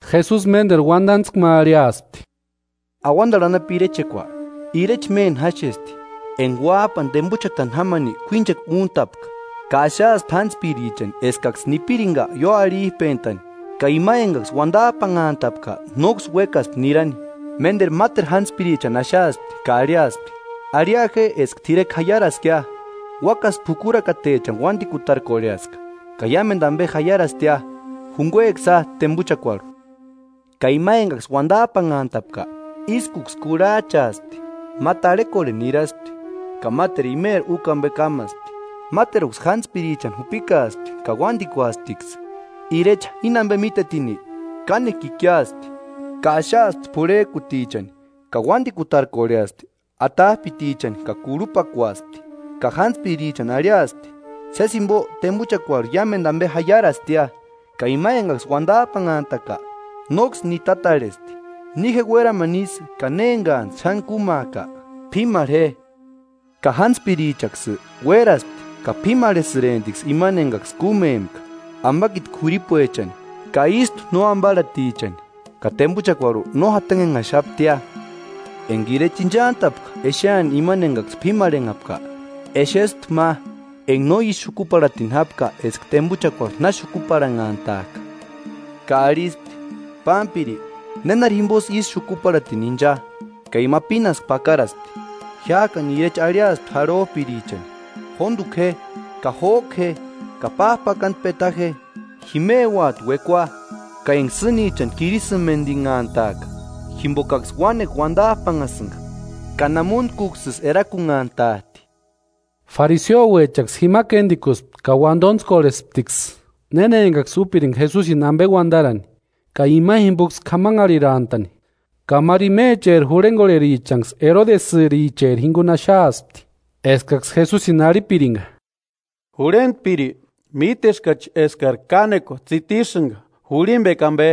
Jesusi ménteru uantantskua ma arhiaspti: “Auantarhu anapu irechekua, ireche méni jáxesti enka uáp'ani tempuchatani jámani k'uínchekua úntapka. Ka axaaspti jántspirichani eskaksï nipirinka ióarhip'entani, ka ima enkaksï uantap'anhantapka nóksï uékaspti nirani. Ménteru máteru játspirichani axaaspti ka arhiaspti: ‘Arhia je eska t'irekua jaiaraskia. Uákasï p'ukurakatechani uantikutarkorheaska, ka iámentu ampe jaiarastia, junkueksïa tempuchakuarhu.’ Ka ima enkaksï uantap'anhantapka ískuksï kurhach'aaspti, ma tarhekorheni niraspti, ka máteru imeri úkua ampe kámaspti, máteruksï jántspirichani jupikaaspti ka uántikuasptiksï. Irecha íni ampe mítetini, kánekua ikiaspti, ka axaaspti p'urhek'utichani ka uántikutarkorheaspti atap'itichani ka kurhupakuaspti. Ka jántspirichani arhiaspti: ‘Sési jimpo tempuchakuarhu iámentu ampe jaiarastia, ka ima enkaksï uantap'anhantaka nóksï nitatarhesti.’ Ni je uéramani ísï ka néni enkats'ï xáni kúmaaka, p'ímarhe je. Ka jántspirichaksï uéraspti ka p'ímarhesïremptiksï imani enkaksï kúmempka, ampakiti k'uiripuechani ka ístu no amparhatichani ka tempuchakuarhu no jantanhenhaxaptia.” “Enka irecha inchant'apka exeani imani enkaksï p'ímarhenhapka, exespti ma enka no ísï xukuparhatini jápka eska tempuchakuarhu na xukuparhanhantak'a, ka arhispti: ‘Pámpiri, ¿Nénari jimposï ísï xukuparhatini incha?’ Ka ima pínasku pakaraspti. Jiák'ani irecha arhiaspti jarhop'irichani: ‘Jóntuku je ka jók'u je ka páp'akantu peta je; jimeuati uekua ka enka sînichani kirisïmentinhantaaka.’ Jimpokaksï uánekua uantap'anhasïnka ka namuntkuksïsï erakunhantat'i.” Fariseuechaksï jima kéntikuspti ka uantontskorhesptiksï néna enkaksï úpirinka Jesusini ampe uantarani, ka imani jimpoksï k'amanharhirantani. Ka máru imecheri jurhenkorherichanksï erodiasïcheri jinkuni axaaspti, eskaksï Jesusini arhipirinka: “Jurhentpiri, míteskachi eskari kánekua tsitisïnka jurhimpekua ampe,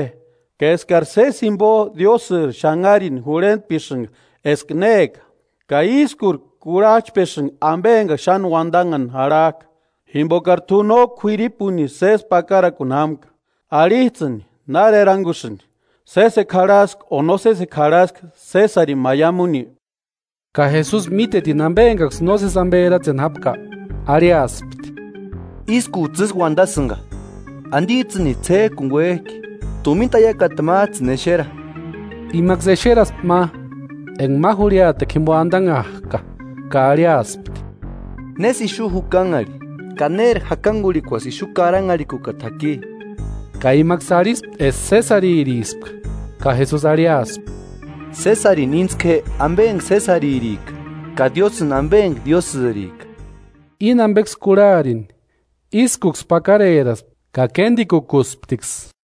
ka eskari sési jimpo Diósïri xanharini jurhentpesïnka eska néka, ka ískuri kurhachpesïnka ampe enka xáni uantanhani jarhak'a, jimpokari t'u no k'uiripunisï sési pakarakuni jámka. Arhits'ïni, ¿Nári erankusïnki? ¿Sésekua jarhaski o no sésekua jarhaski Sésarini maiamuni?” Ka Jesusi mítetini ampe enkaksï nósesi ampe eratseni jápka, arhiaspti: “Ískuts'ï ísï uantasïnka, ¿Antits'ïnisï ts'ék'uni uék'i? Tumina taiakata máts'ï exera.” Imaksï exeraspti ma enka ma jurhiatekua jimpo antanhak'a. Ka arhiaspti: “¿Nésï ixu jukanharhi, ka néri jakankurhikuasï ixu karanharhikukata jaki?” Ka imaksï arhispti eska Sésaririspka. Ka Jesusi arhiaspti: “Sésarini íntsku je ampe enka Sésaririka, ka Diósïni ampe enka Diósïrika.” Íni ampeksï kurharini ískuksï pakareraspti ka kéntikukusptiksï.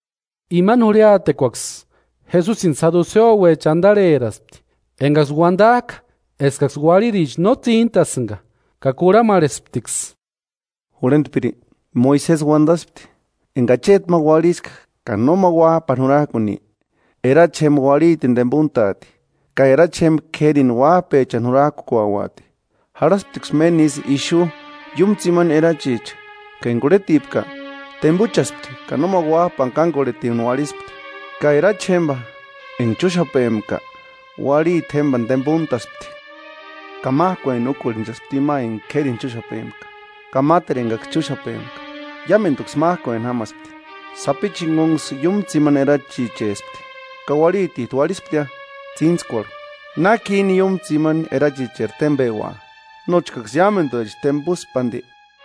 Imani jurhiatekuaksï Jesusini saduseuecha antarheraspti, enkaksï uantak'a eskaksï uarhiricha no tsíntasïnka, ka kurhamarhesptiksï: “Jurhentpiri, Moisesi uantaspti: ‘Enka acheti ma uarhiska ka nóma uáp'ani jurak'uni, erachi jémpa uarhitini tempuntaati, ka erachi jémpa k'érini uáp'echani jurak'ukuauati.’ Jarhasptiksï méni ísï ixu iúmu tsimani erachicha ka enka urhetipka, tempuchaspti ka nóma uáp'ani kánkorhetini uarhispti, ka erachi jémpa enka chúxapempka uarhiti jémpani tempuntaspti. Ka mák'ueni úkorhenchaspti ima enka k'érini chúxapempka, ka máteru enkaksï chúxapempka, iámentuksï mák'ueni jámaspti, sapichu jinkunksï iúmu tsimani erachichespti. Ka uarhitit'u uarhisptia. Tsíntskuarhu, ¿Náki íni iúmu tsimani erachicheri tempeua? Nóchkaksï iámentuecha tempuspi anti”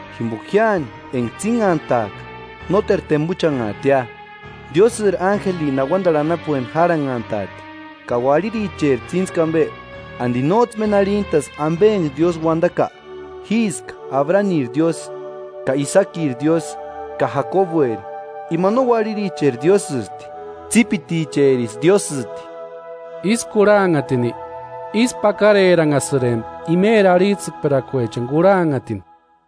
jimpoka jiáni enka tsínhantaaka nóteru tempuchanhaatia, Diósïri ánjelini auantarhu anapueni járhanhantaati. Ka uarhiricheri tsíntskua ampe, ¿Anti nóts'ï méni arhintaski ampe enka Diósï uantaka? ‘Jíska Abraniri Diósï, ka Isakiri Diósï, ka Jakobueri’ Ima no uarhiricheri Diósïsti, tsípiticherisï Diósïti.” Ísï kurhanhatini, ísku pakareranhasïrempti imeri arhits'ïkperakuechani kurhanhatini.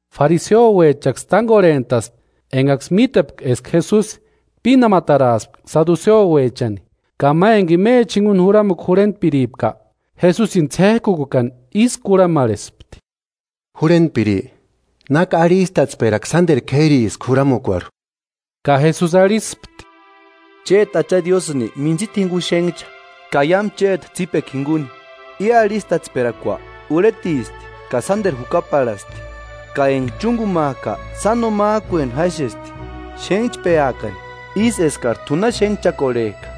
Fariseuechaksï tánkorhent'aspti enkaksï mítepka eska Jesusi pínamataraaspka saduseuechani. Ka ma enka imecha jinkuni juramukua jurhentpiripka, Jesusini ts'ék'ukuekani ísï kurhamarhespti: “Jurhentpiri, ¿Náki arhistatsperakua sánteru k'ériski juramukuarhu?” Ka Jesusi arhispti: “Chéti Acha Diósïni mintsita jinkuni xénhcha ka iámu chéti tsípekua jinkuni. I arhistatsperakua urhetisti ka sánteru jukaparhasti. Ka enka chúnkumak'a sáno mák'ueni jáxesti: ‘Xénhchpeakari ísï eskari t'u na xénhchakorhek'a.’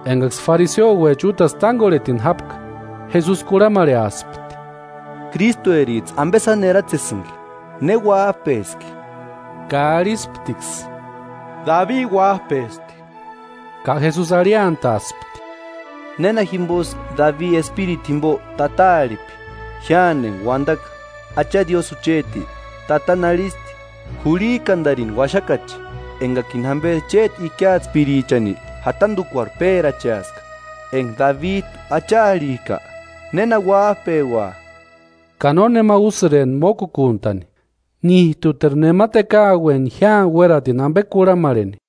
Enkaksï fariseuecha útasï tánkorhetini jápka, Jesusi kurhamarheaspti: “¿Krístuerits'ï ampe sáni eratsesïnki? ¿Ne uáp'eski?” Ka arhisptiksï: “Dabi uáp'esti.” Ka Jesusi arhiantaaspti: “¿Néna jimposï Dabi Espirituni jimpo Tata arhipki? Jiáni enka uantaka: ‘Acha Diósï jucheti, Tatani arhisti: Jurhik'antarini uaxakache, enkakini jamperi chéti ikiatspirichani jantantukuarhu péracheaska’ Enka Dabit'u Acha arhik'a, ¿Néna uáp'eua?” Ka nónema úsïrempti mókukuntani: Nít'uteru nema tekaueni jiáni uératini ampe kurhamarheni.